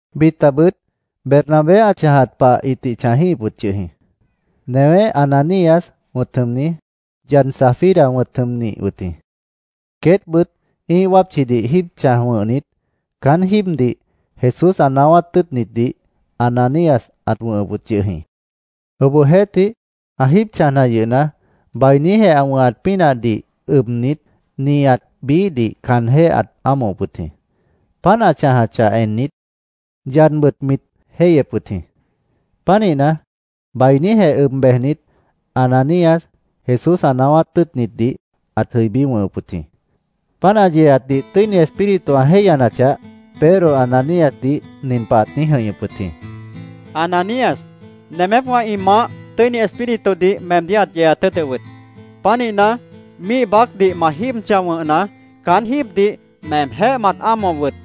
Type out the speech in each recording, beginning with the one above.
Bitabʉt Bernabé ã chãjat pah ĩtih chãjíhip wʉt yʉh jĩ. Newé Ananías wʉ̃t jʉmni, yad Safira wʉ̃t jʉmnih wʉt jĩ. Queétbʉt ĩ́ih wápchidih jíib chãj wʉ̃hnit, caán jíibdih Jesús ã naáwát tʉ́ʉtnitdih Ananías ãt wʉ̃hʉp wʉt yʉh jĩ. Obohjeéhtih, ã jíib chãjna yʉhna, bainíjeh ã wʉ̃hat pínahdih ʉbnit, nihat biíhdih caanjéh ãt ámohop wʉt jĩ. Páant ã chãjachah ennit, yadbʉt mit jéihyep wʉt jĩ. Pánihna, bainíjeh ʉb bejnit, Ananías Jesús ã naáwát tʉ́ʉtnitdih ãt jʉibí wʉ̃hʉp wʉt jĩ. Páant ã yeeatdih Tʉ́ini Espíritu ã jéihyanachah, Pedro Ananíasdih nin pah ãt niíj jʉ̃ihñʉp wʉt jĩ: —Ananías, nemépwã ĩ maáh Tʉ́ini Espíritudih meemdíh ãt yeeat tʉ́ʉtʉp wʉt. Pánihna, míih baácdih ma jíib chãj wʉ̃hna, caán jíibdih meemjéh mat ámohop wʉt.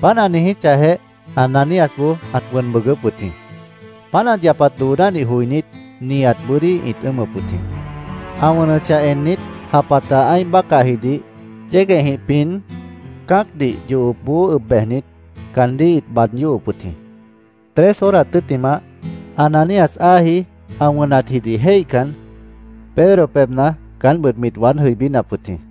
Páant ã niijíchahjeh, Ananíasboó ãt wʉn bʉʉgʉ́p wʉt jĩ. Páant ã yapat doonádih joinít, nihat bʉ́dí ĩt ʉ́ʉmʉp wʉt jĩ. Ã wʉnʉchah ennit, japata ã́ih bácahjidih yéguehjĩh pin, cã́acdih yohopboó ʉb bejnit, caandíh ĩt baad yóhop wʉt jĩ. Tres horas tʉ́ttimah, Ananías áaji ã wʉnatjidih jéihcan, Pedro pebhna caántbʉt mit waád jʉibínap wʉt jĩ.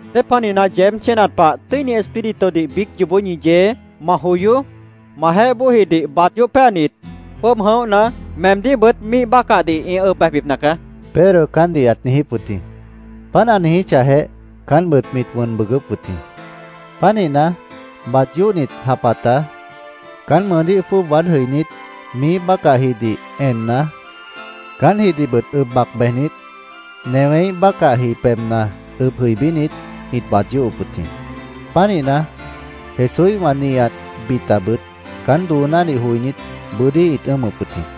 —¿Dépanihna yeéb chénat pah Tʉ́ini Espíritudih biíc yoobó ñi yee? Ma joyoó. Majeéh bóojidih baad yóh péanit, jwʉ́ʉb jʉ̃óhna, meemdíhbʉt míih bácahdih ĩ ʉb bejbipna caá, Pedro caántdih ãt niijíp wʉt jĩ. Páant ã niijíchahjeh, caántbʉt mit wʉn bʉʉgʉ́p wʉt jĩ. Pánihna, baad yóhnit japata caán mʉʉdíh jwʉ́ʉb waád jʉibínit, miíh bácahjidih enna, caántjidihbʉt ʉb bac bejnit, newéíh bácahji pebhna ʉb jʉibínit, ĩt baad yóhop wʉt jĩ. Pánihna, Jesúíhwã, nihat bitabʉt caán doonádih joinít, bʉ́dí ĩt ʉ́ʉmʉp wʉt jĩ.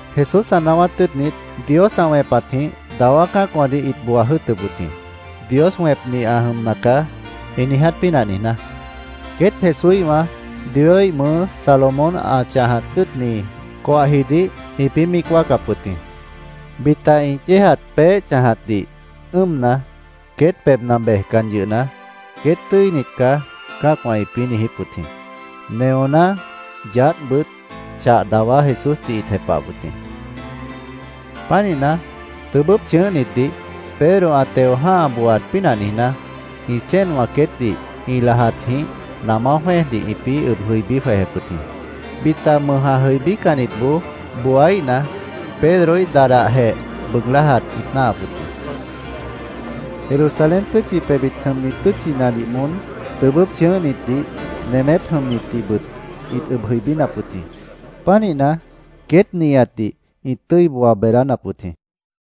Jesús ã naáwát tʉ́ʉtnit Dios ã wẽpatjĩh dawá cã́acwãdih ĩt booa jʉ́ʉtʉp wʉt jĩ, “Dios wẽpni ã jʉmna caá”, ĩ niiját pínah niijná. Queét Jesúíhwã Dioíh mʉʉ́ Salomón ã chãjat tʉ́ʉtni coahjidih ĩpĩ́ míic wáacap wʉt jĩ. Bita ĩ yéejat peéh chãjatdih ʉ́ʉmna, queét pebhna bejcan yʉhna, “Queét tʉ́init caá”, cã́acwã ĩpĩ́ niijíp wʉt jĩ. Neoná, yaádhbʉt, chah dawá Jesúsdih ĩt jepahap wʉt jĩ. Pánihna, tʉbʉ́p chʉ̃ʉ́hnitdih Pedro ã teo jã́ha booaat pínah niijná, ĩ chéenwã queétdih ĩ lajatjĩh namá jwẽ́ejdih ĩpĩ́ ʉb jʉibí jwejep wʉt jĩ. Bita ã mʉj jʉibícannitboó booíhna, Pedroíh dadahjeh bʉʉg lájat ĩt náahap wʉt jĩ. Jerusalén tʉ́tchi pebhbit jʉmni tʉ́tchinadih moón tʉbʉ́p chʉ̃ʉ́hnitdih, nemép jʉmnitdihbʉt ĩt ʉb jʉibínap wʉt jĩ. Pánihna, queét nihatdih ĩt tʉ́i booa beedánap wʉt jĩ.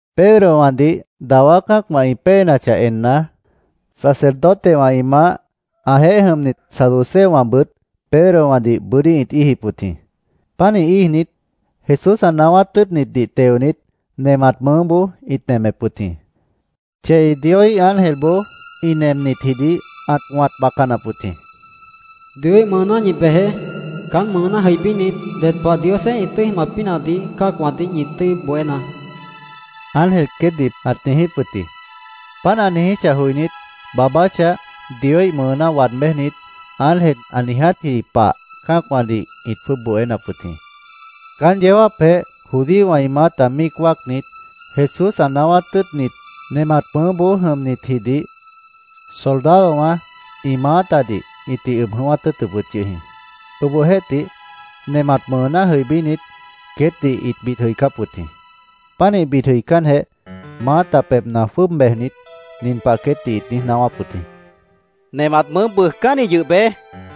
Pedrowãdih dawá cã́acwã ĩ péenachah enna, sacerdotewã ĩ maáh, ãjeéh jʉmnit saduceowãbʉt Pedrowãdih bʉ́dí ĩt íijip wʉt jĩ. Pánih íijnit, Jesús ã naáwát tʉ́ʉtnitdih teonit, nemat mʉʉ́boó ĩt nemep wʉt jĩ. Chei Dioíh ángelboó ĩ nemnitjidih ãt wãt bacanap wʉt jĩ. “Dioíh mʉʉná ñi bejeé. Caán mʉʉná jʉibínit, ded pah Diosjeéh ĩ tʉ́i jʉmat pínahdih cã́acwãdih ñi tʉ́i bohénaá”, ángel queétdih ãt niijíp wʉt jĩ. Páant ã niijíchah joinít, baabáchah, Dioíh mʉʉná waad béjnit, ángel ã niijátji pah cã́acwãdih ĩt jwʉ́ʉb bohénap wʉt jĩ. Caán yeó jáapjeh judíowã ĩ maáta míic wáacnit, Jesús ã naáwát tʉ́ʉtnit nemat mʉʉ́boó jʉmnitjidih soldadowã ĩ maátadih ĩtih ʉb jʉ̃ʉ́wát tʉ́ʉtʉp wʉt yʉh jĩ. Obohjeéhtih, nemat mʉʉná jʉibínit, queétdih ĩt bid jʉicáp wʉt jĩ. Pánih bid jʉicánjeh, maáta pebhna jwʉ́ʉb bejnit, nin pah queétdih ĩt niíj naáwáp wʉt jĩ: —Nemat mʉʉ́ jẽc bʉʉjcánni yʉh beé.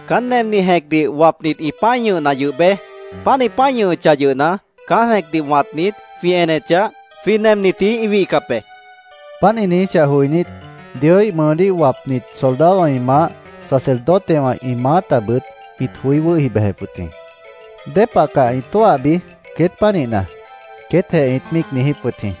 Caán nemni jẽcdih wapnit ĩ pã́i ñʉhna yʉh beé. Páant ĩ pã́i ñʉhʉchah yʉhna, caán jẽcdih wãtnit, jwĩ enechah, jwĩ nemnitji ĩ wihcap be, ĩt niijíp wʉt jĩ. Páant ĩ niijíchah joinít, Dioíh mʉʉdíh wapnit soldadowã ĩ maáh, sacerdotewã ĩ maátabʉt ĩt joí wʉ́hi bejep wʉt jĩ. “¿Dépah caá ĩ tóahbi queét pánihna?” queétjeh ĩt míic niijíp wʉt jĩ.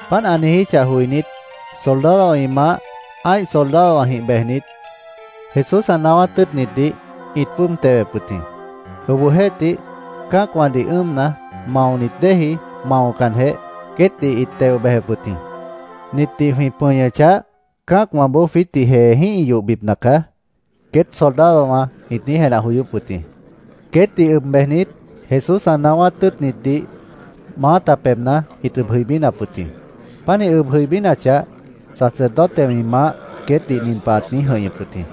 Páant ã niijíchah joinít, soldadowã ĩ maáh, ã́ih soldadowãjĩh bejnit, Jesús ã naáwát tʉ́ʉtnitdih ĩt jwʉ́ʉb tewep wʉt jĩ. Obohjeéhtih, cã́acwãdih ʉ́ʉmna, maonit déeji maocanjeh, queétdih ĩt teo bejep wʉt jĩ. “Nitdih jwĩ pʉñʉchah, cã́acwãboó jwiítdih jeejĩ́h ĩ yohbipna nacaá”, queét soldadowã ĩt niíj jenah joyóp wʉt jĩ. Queétdih ʉb bejnit, Jesús ã naáwát tʉ́ʉtnitdih maáta pebhna ĩt ʉb jʉibínap wʉt jĩ. Pánih ʉb jʉibínachah, sacerdotewã ĩ maáh queétdih nin pah ãt niíj jʉ̃ihñʉp wʉt jĩ: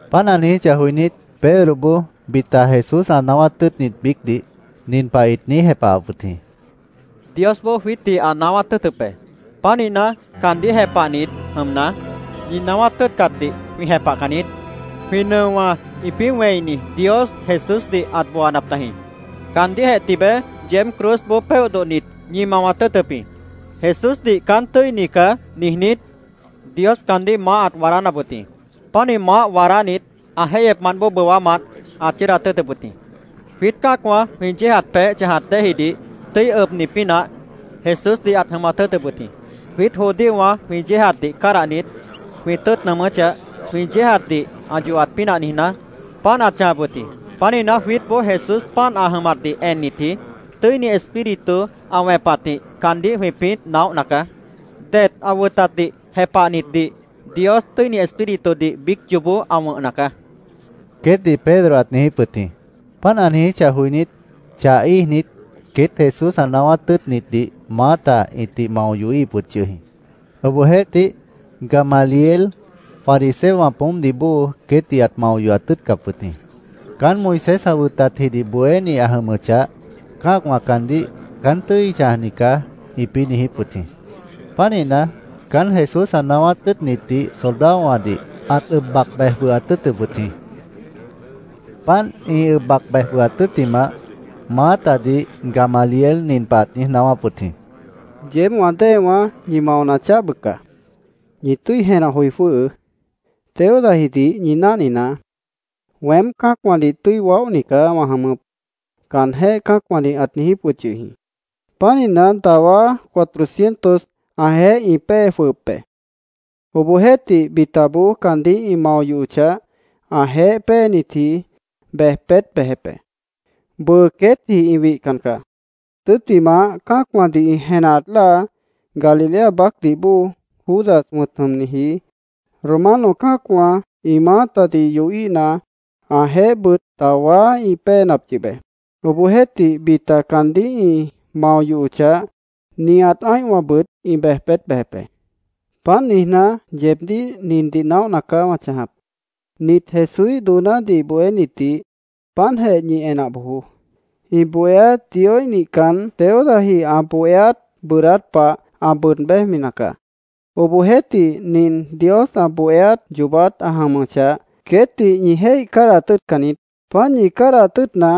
Páant ã niijíchah joinít, Pedroboó bita Jesús ã naáwát tʉ́ʉtnit biícdih nin pah ĩt niíj jepahap wʉt jĩ: —Diosboó jwiítdih ã naáwát tʉ́ʉtʉp be. Pánihna, caandíh jepahnit jʉmna, ñi naáwát tʉ́ʉtcatdih jwĩ jepahcan niít. Jwĩ nʉowã ĩpĩ́ wẽini Dios Jesúsdih ãt booanap tajĩ. Caandíhjeh tibeé yeéb cruzboó péoh dodhnit, ñi mawat tʉ́ʉtʉp jĩ. Jesúsdih ‘Caán tʉ́ini caá’, niijnít, Dios caandíh maáh ãt waadánap wʉt jĩ. Pánih maáh waadánit, ã jéihyepmant bóo bʉwámant ãt chʉ́ʉdat tʉ́ʉtʉp wʉt jĩ. Jwiít cã́acwã jwĩ yéejat peéh chãjat déejidih tʉ́i ʉbni pínah Jesúsdih ãt jʉmat tʉ́ʉtʉp wʉt jĩ. Jwiít judíowã jwĩ yéejatdih cádahnit, jwĩ tʉ́ʉt nʉʉmʉ́chah, jwĩ yéejatdih ã yohat pínah niijná, páant ãt chãjap wʉt jĩ. Pánihna, jwiítboó Jesús páant ã jʉmatdih ennitji, Tʉ́ini Espíritu ã wẽpatjĩh caandíh jwĩpĩ́ naóhna caá. Det ã wʉtatdih jepahnitdih Dios Tʉ́ini Espíritudih biíc yoobó ã wʉ̃hna caá, queétdih Pedro ãt niijíp wʉt jĩ. Páant ã niijíchah joinít, chah íijnit, queét Jesús ã naáwát tʉ́ʉtnitdih maáta ĩtih mao yohíhip wʉt yʉh jĩ. Obohjeéhtih, Gamaliel, fariseowã poómpdih bóo, queétdih ãt mao yohat tʉ́ʉtcap wʉt jĩ. Caán Moisés ã wʉtatjidih bohéni ã jʉmʉchah, cã́acwã caandíh “Caán tʉ́i chãjni caá”, ĩpĩ́ niijíp wʉt jĩ. Pánihna, caán Jesús ã naáwát tʉ́ʉtnitdih soldadowãdih ãt ʉb bac bej jwʉhat tʉ́ʉtʉp wʉt jĩ. Páant ĩ ʉb bac bej jwʉhat tʉ́ttimah, maátadih Gamaliel nin pah ãt niíj naáwáp wʉt jĩ: —Yeéb wã déewãá, ñi maona chaáh bʉca. Ñi tʉ́i jenah joi jwʉ́hʉʉ́. Teudajidih ñi náhninaá. ‘Weém cã́acwãdih tʉ́i waóhni caá wã jʉmʉp’, caanjéh cã́acwãdih ãt niijíp wʉt yʉh jĩ. Pánihna, dawá, cuatrocientos ãjeéh ĩ péenap yʉh be. Obohjeéhtih, bitaboó caandíh ĩ mao yohochah, ãjeéh péenitji ĩ bej peét bejep be. Bʉʉ queétji ĩ wihcan caá. Tʉ́ttimah, cã́acwãdih ĩ jenah enat láa Galilea baácdih bóo Judas wʉ̃t jʉmniji Romano cã́acwã ĩ maátadih yohíhna, ãjeéhbʉt dawá ĩ péenap yʉh be. Obohjeéhtih, bita caandíh ĩ mao yohochah, nihat ã́ihwãbʉt ĩ bej peét bejep be. Páant niijná, yeebdíh nindih naóhna caá wã chãjap. Nit Jesúíh doonádih bohénitdih páantjeh ñi enah bojoó. Ĩ bohéát Dioíh nihcan, Teudaji ã bohéát bʉʉdát pah ã bʉʉd béjmina caá. Obohjeéhtih, nin Dios ã bohéát yoobát ã jʉmʉchah, queétdih ñi jéih cádahat tʉ́ʉtcan niít. Páant ñi cádahat tʉ́ʉtna,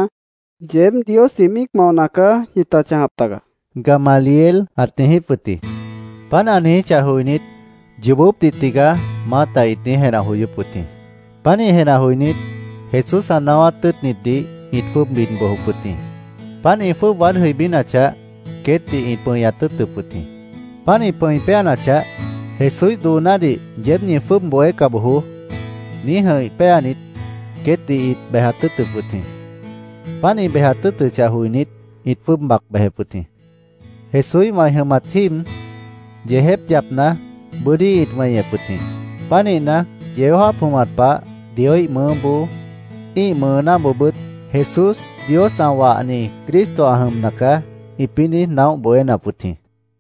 yeéb Diosjĩh míic maona caá ñita chãjap taga, Gamaliel ãt niijíp wʉt jĩ. Páant ã niijíchah joinít, “Yoobópdih tigaá”, maáta ĩt niíj jenah joyóp wʉt jĩ. Pánih jenah joinít, Jesús ã naáwát tʉ́ʉtnitdih ĩt jwʉ́ʉb bid bojop wʉt jĩ. Páant ĩ jwʉ́ʉb waád jʉibínachah, queétdih ĩt pʉñat tʉ́ʉtʉp wʉt jĩ. Páant ĩ pʉ̃i péanachah, “Jesúíh doonádih yeéb ñi jwʉ́ʉb bohéca bojoó”, niíj jʉ̃ih péanit, queétdih ĩt bejat tʉ́ʉtʉp wʉt jĩ. Páant ĩ bejat tʉ́ʉtʉchah joinít, ĩt jwʉ́ʉb bac bejep wʉt jĩ. Jesúíhwã ĩ jʉmat jíib, yeejép yapna, bʉ́dí ĩt weñep wʉt jĩ. Pánihna, yeó jáap jʉmat pah Dioíh mʉʉ́boó, ĩ́ih mʉʉnáboobʉ́t “Jesús Dios ã wahni Cristo ã jʉmna caá”, ĩpĩ́ niíj naóh bohénap wʉt jĩ.